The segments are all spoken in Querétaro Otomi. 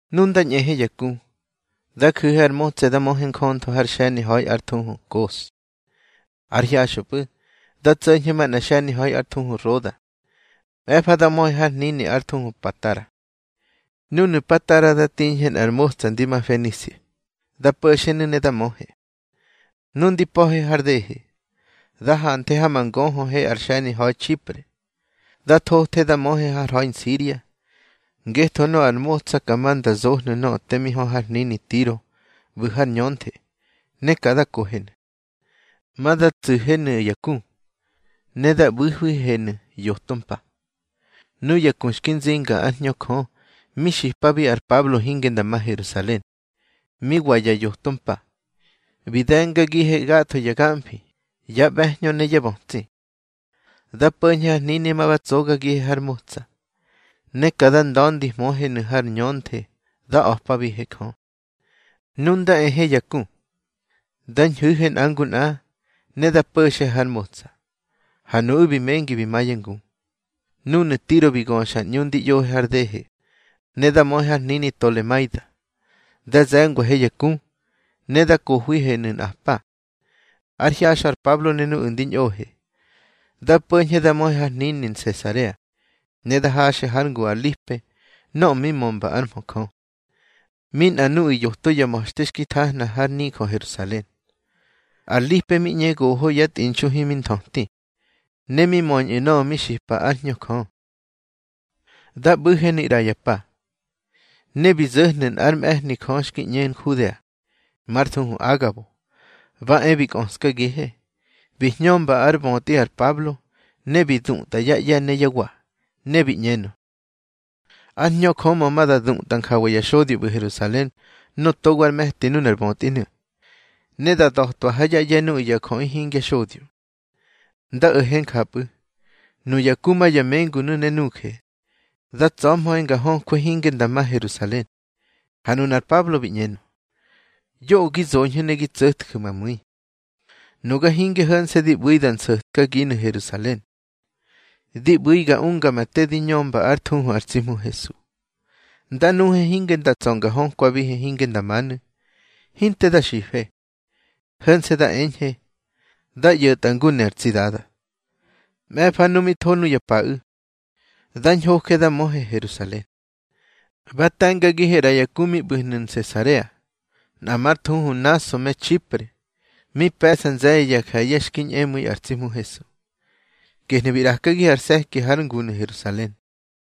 Nu nda ñꞌehe ya ku, da ju̱he ar motsa da möhe njöntho har xe̱ni ha̱i ár thuhu Kos. Ár hyaxꞌöpꞌu̱ da tso̱ñhe manꞌar xe̱ni ha̱i ár thuhu Roda. Mꞌe̱fa da möhe har hnini ár thuhu Patara. Núnu̱ Patara da tiñhe nꞌar motsa ndi ma Fenisia, dá po̱xenu̱ ne da möhe. Nu ndi pa̱he har dehe, da hanthe ha ma ngöhöhe ar xe̱ni ha̱i Txipre. Da thothe da möhe har ha̱i Nsiria, ngetho nöꞌö ar motsa ka ma nda zohnu̱ nöꞌö te mi hö har hnini Tiro ꞌbu̱ har ñönthe, ne ka da kohenu̱. Ma da tsu̱henu̱ ya ku, ne da ꞌbu̱hwihenu̱ yoto mpa. Nuya ku xki nzinga ár Hñö Jö mi xipabi ar Pablo hinge nda ma Herusalen. Mi wa ya yoto mpa, bi de̱ngagihe gatho ya gamfi, yá ꞌbe̱hñö ne yá bötsi. Da po̱ñhe har hnini ma ba tsogagihe har motsa, ne ka da nda̱ndihmöhenu̱ har ñönthe da a̱pabihe Jö. Nu nda ehe ya ku, da ñhu̱he nꞌa ngu nꞌa, ne da po̱xe har motsa, ha nuꞌu̱ bi mengi bi ma yá ngu. Núnu̱ Tiro bi göxa ar ꞌñu ndi ꞌyohe har dehe, ne da möhe har hnini Tolemaida. Da ze̱ngwahe ya ku, ne da kohwihenu̱ nꞌa pa. Ár hyaxꞌö ar Pablo ne nuꞌu̱ ndi ñꞌohe, da po̱ñhe da möhe har hnini Nsesarea. Ne da haxe hár ngu ar Lipe nöꞌö mi mömba ár mhö Jö, mi nꞌa nuꞌu̱ yoto ya ma̱xte xki thahna har nijö Herusalen. Ar Lipe mi ꞌñe goho yá tꞌinxu himi nthöti, ne mi möñꞌu̱ nöꞌö mi xipa ár Hñö Jö. Da ꞌbu̱henu̱ ꞌra ya pa, ne bi zo̱hnu̱ nꞌár mꞌe̱hni Jö xki ꞌñe Nhudea, már thuhu Agabo. Ba e bi kꞌöskagihe, bi hñömba ár bötꞌi ar Pablo, ne bi dutꞌa yá ꞌye̱ ne yá wa, ne bi ꞌñenö: —Ár Hñö Jö mö ma da dutꞌa njawa ya xodyo ꞌbu̱ Herusalen nöꞌö togo ár me̱ti nuna ar bötꞌinu̱, ne da da̱twa ha yá ꞌye̱ nuꞌu̱ ya jöꞌi hingya xodyo. Nda o̱he njapꞌu̱, nuya ku ma ya mengunu̱ ne nuje, da tsa̱hmöhe nga hökwe hinge nda ma Herusalen. Ha nunar Pablo bi ꞌñenö: —Yoꞌö gi zoñhu̱ ne gi tso̱tju̱ ma mu̱i. Nuga hinge ho̱nse̱ di ꞌbu̱i da nso̱tkaginu̱ Herusalen, di ꞌbu̱i ga unga ma te di ñömba ár thuhu ar tsi Hmu Hesu. Nda nuhe hinge nda tsa̱ nga hökwabihe hinge nda manu̱. Hinte da xife, ho̱nse̱ da eñhe: —Da ꞌyo̱tꞌa ngu ne ar tsi Dada. Mꞌe̱fa nu mi tho nuya paꞌu̱, da ñhoje da möhe Herusalen. Ba te̱ngagihe ꞌra ya ku mi ꞌbu̱hnu̱ Nsesarea, nꞌa már thuhu Naso me Txipre. Mi pe̱ꞌsa nze̱ye̱ ya je̱ye̱ xki ñꞌemu̱i ar tsi Hmu Hesu. Gehnu̱ bi ꞌrakagihe ar se̱ki hár ngunu̱ Herusalen.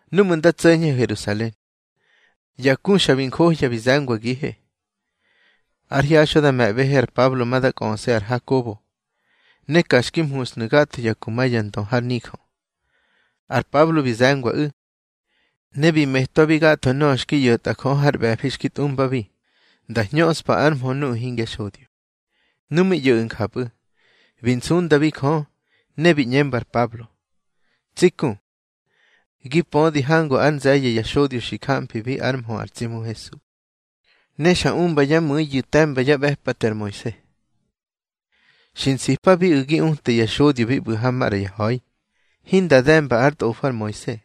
Núꞌmu̱ nda tso̱ñhe Herusalen, ya ku xa bi njohya bi ze̱ngwagihe. Ár hyaxꞌö da me̱ꞌbehe ar Pablo ma da kꞌöse ar Hakobo, ne ka xki mhushnu̱ gatho ya ku ma ya ndö har nijö. Ar Pablo bi ze̱ngwaꞌu̱, ne bi metwabi gatho nöꞌö xki ꞌyo̱tꞌa Jö hár ꞌbe̱fi xki tꞌumbabi, nda hñöꞌspa ár mhö nuꞌu̱ hingya xodyo. Nu mi ꞌyo̱ꞌu̱ njapꞌu̱, bi nsundabi Jö, ne bi ꞌñemba ar Pablo: —Tsi ku, gi pödi hangu ár nze̱ye̱ ya xodyo xi jamfibi ár mhö ar tsi Hmu Hesu, ne xa umba yá mu̱iyu̱ te̱mba yá ꞌbe̱pate ar Moise. Xi nsipabiꞌu̱ gi uta ya xodyo bi ꞌbu̱ ha maꞌra ya ha̱i, hinda de̱mba ár tꞌofo ar Moise.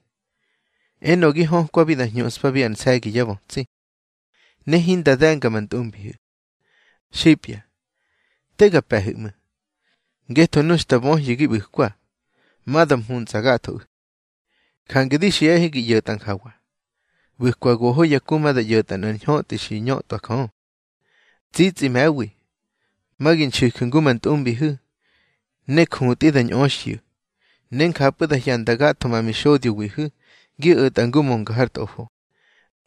Enö gi hökwabi da hñuꞌspabi ar nse̱gi yá bötsi, ne hinda de̱nga ma ntꞌumbihu̱. Xipya, te ga pe̱hu̱ ꞌmu̱. Ngetho nu xta böhyu̱ gi ꞌbu̱kwa, ma da mhuntsꞌa gathoꞌu̱. Jange di xiꞌahe gi ꞌyo̱tꞌa njawa: ꞌBu̱kwa goho ya ku ma da ꞌyo̱tꞌa nꞌar ñhötꞌi xi ñötꞌwa Jö. Tsitsꞌi me̱wi, ma gi nxu̱ju̱ ngu ma ntꞌumbihu̱, ne jutꞌi da ñꞌöxyu̱. Ne njapꞌu̱ da hyanda gatho ma mixodyohu̱ gi o̱tꞌa ngu mönga har tꞌofo,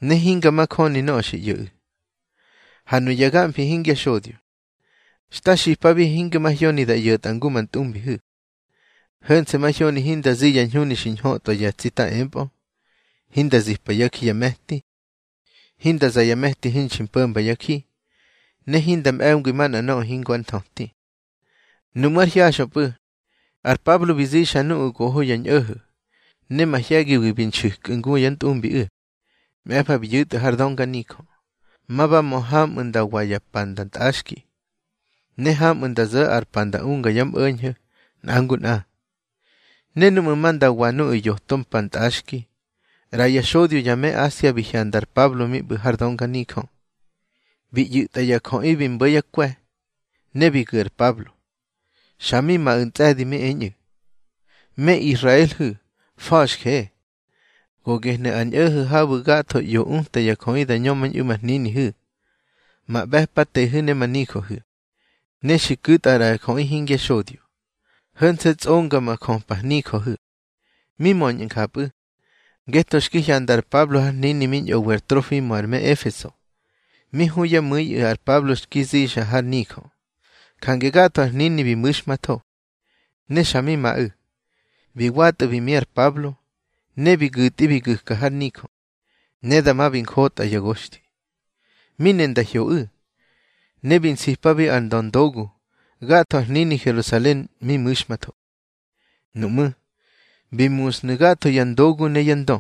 ne hinga majöni nöꞌö xi ꞌyo̱ꞌu̱. Ha nuya gamfi hingya xodyo, xta xipabihe hinga mahyoni da ꞌyo̱tꞌa ngu ma ntꞌumbihu̱. Ho̱nse̱ mahyoni hinda zi ya ñhuni xi ñhötꞌwa ya tsita empꞌö, hinda zipa yá ji ya me̱ti, hinda za ya me̱ti hinxi po̱mba ár ji, ne hinda mꞌe̱ngwi manꞌa nöꞌö hingo ár nthöti. Nuꞌmú̱ ár hyaxꞌöpꞌu̱, ar Pablo bi zixa nuꞌu̱ goho ya ñꞌo̱ho̱, ne mahye̱giwi bi nxu̱kꞌu̱ ngu yá ntꞌumbiꞌu̱. Mꞌe̱fa bi yu̱tꞌu̱ har dönganijö, ma ba mö hamꞌu̱ nda wa ya pa nda ntꞌaxki, ne hamꞌu̱ nda zo̱ ar pa nda unga yá mꞌo̱ñho̱ nꞌa ngu nꞌa. Ne núꞌmu̱ ma nda wa nuꞌu̱ yoto mpa ntꞌaxki, ꞌra ya xodyo ya me Asia bi hyanda ar Pablo mi ꞌbu̱ har dönganijö, bi ꞌyu̱tꞌa ya jöꞌi bi mbo̱ yá kwe̱, ne bi gu̱ ar Pablo. Xa mi maꞌu̱ ntsꞌe̱di mi eñꞌu̱: —Me Israelhu̱, fa̱xje. Go gehnu̱ ar ñꞌo̱ho̱ habu̱ gatho ꞌyo uta ya jöꞌi da ñömañꞌu̱ ma hninihu̱, ma ꞌbe̱patehu̱ ne ma nijöhu̱. Ne xi ku̱tꞌa ꞌra ya jöꞌi hingya xodyo, ho̱nse̱ tsꞌonga ma jöpa nijöhu̱. Mi möñꞌu̱ njapꞌu̱, ngetho xki hyanda ar Pablo har hnini mi ñꞌowi ar Trofimo ar me Efeso, mi hu yá mu̱iꞌu̱ ar Pablo xki zixa har nijö. Jange gatho ar hnini bi mu̱xmatho, ne xa mi maꞌu̱. Bi watꞌu̱ bi mi ar Pablo, ne bi gu̱tꞌi bi gu̱ka har nijö, ne dama bi njotꞌa ya goxthi. Mi ne nda hyoꞌu̱, ne bi nsipabi ar ndöndogu, gatho ar hnini Herusalen mi mu̱xmatho. Nuꞌmú̱, bi musnu̱ gatho ya ndogu ne yá ndö,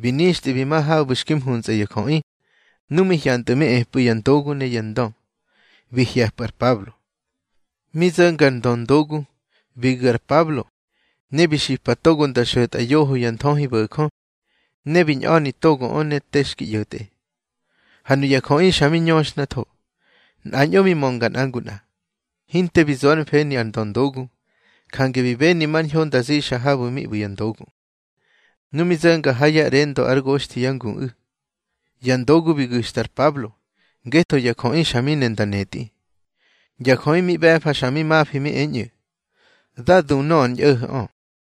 bi nixtꞌi bi ma habu̱ xki mhuntsꞌa ya jöꞌi. Nu mi hyantꞌu̱ mi epꞌu̱ ya ndogu ne yá ndö, bi hye̱pꞌu̱ ar Pablo. Mi zo̱nga ar ndöndogu, bi gu̱ ar Pablo, ne bi xipa togo nda xo̱tꞌa yoho ya nthöhibo̱jö, ne bi ñꞌa̱ni togoꞌö ne te xki ꞌyo̱tꞌe. Ha nuya jöꞌi xa mi ñöxhnatho, nꞌañꞌo mi mönga nꞌa ngu nꞌa. Hinte bi zo ár mfeni ar ndöndogu, jange bi beni mar ñho nda zixa habu̱ mi ꞌbu̱ ya ndogu. Nu mi zo̱nga ha ya ꞌrendo ár goxthi yá nguꞌu̱, ya ndogu bi gu̱xta ar Pablo, ngetho ya jöꞌi xa mi ne nda netꞌi. Ya jöꞌi mi ꞌbe̱fa xa mi mafi mi eñꞌu̱: —Dá du nöꞌö ar ñꞌo̱ho̱ꞌö.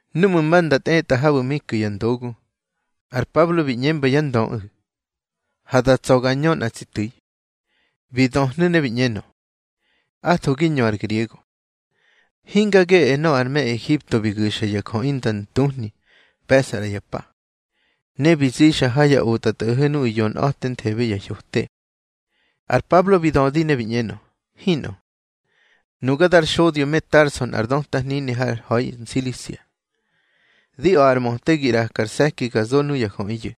Núꞌmu̱ ma nda tꞌetꞌa habu̱ mi ku̱ ya ndogu, ar Pablo bi ꞌñemba yá ndöꞌu̱: —Ha da tsa̱ ga ñö nꞌa tsi tu̱i. Bi döhnu̱ ne bi ꞌñenö: —Atho gi ñö ar griego. Hinga geꞌe nöꞌö ar me Ehipto bi gu̱xa ya jöꞌi nda ntuhni pe̱ꞌsa ꞌra ya pa, ne bi zixa ha ya otꞌatꞌo̱ho̱ nuꞌu̱ yonꞌa̱tenthebe ya hyote. Ar Pablo bi dödi ne bi ꞌñenö: —Hinꞌö. Nuga dar xodyo me Tarso nꞌar döta hnini har ha̱i Nsilisia. Di a̱ꞌar möte gi ꞌraka ar se̱ki ga zo nuya jöꞌiyu̱.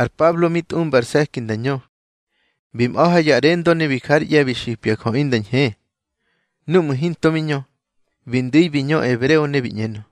Ar Pablo mi tꞌumba ar se̱ki nda ñö, bi mꞌa̱ ha ya ꞌrendo ne bi jár ꞌye̱ bi xipya jöꞌi nda ñhe. Núꞌmu̱ hinto mi ñö, bi ndu̱i bi ñö ebreo, ne bi ꞌñenö: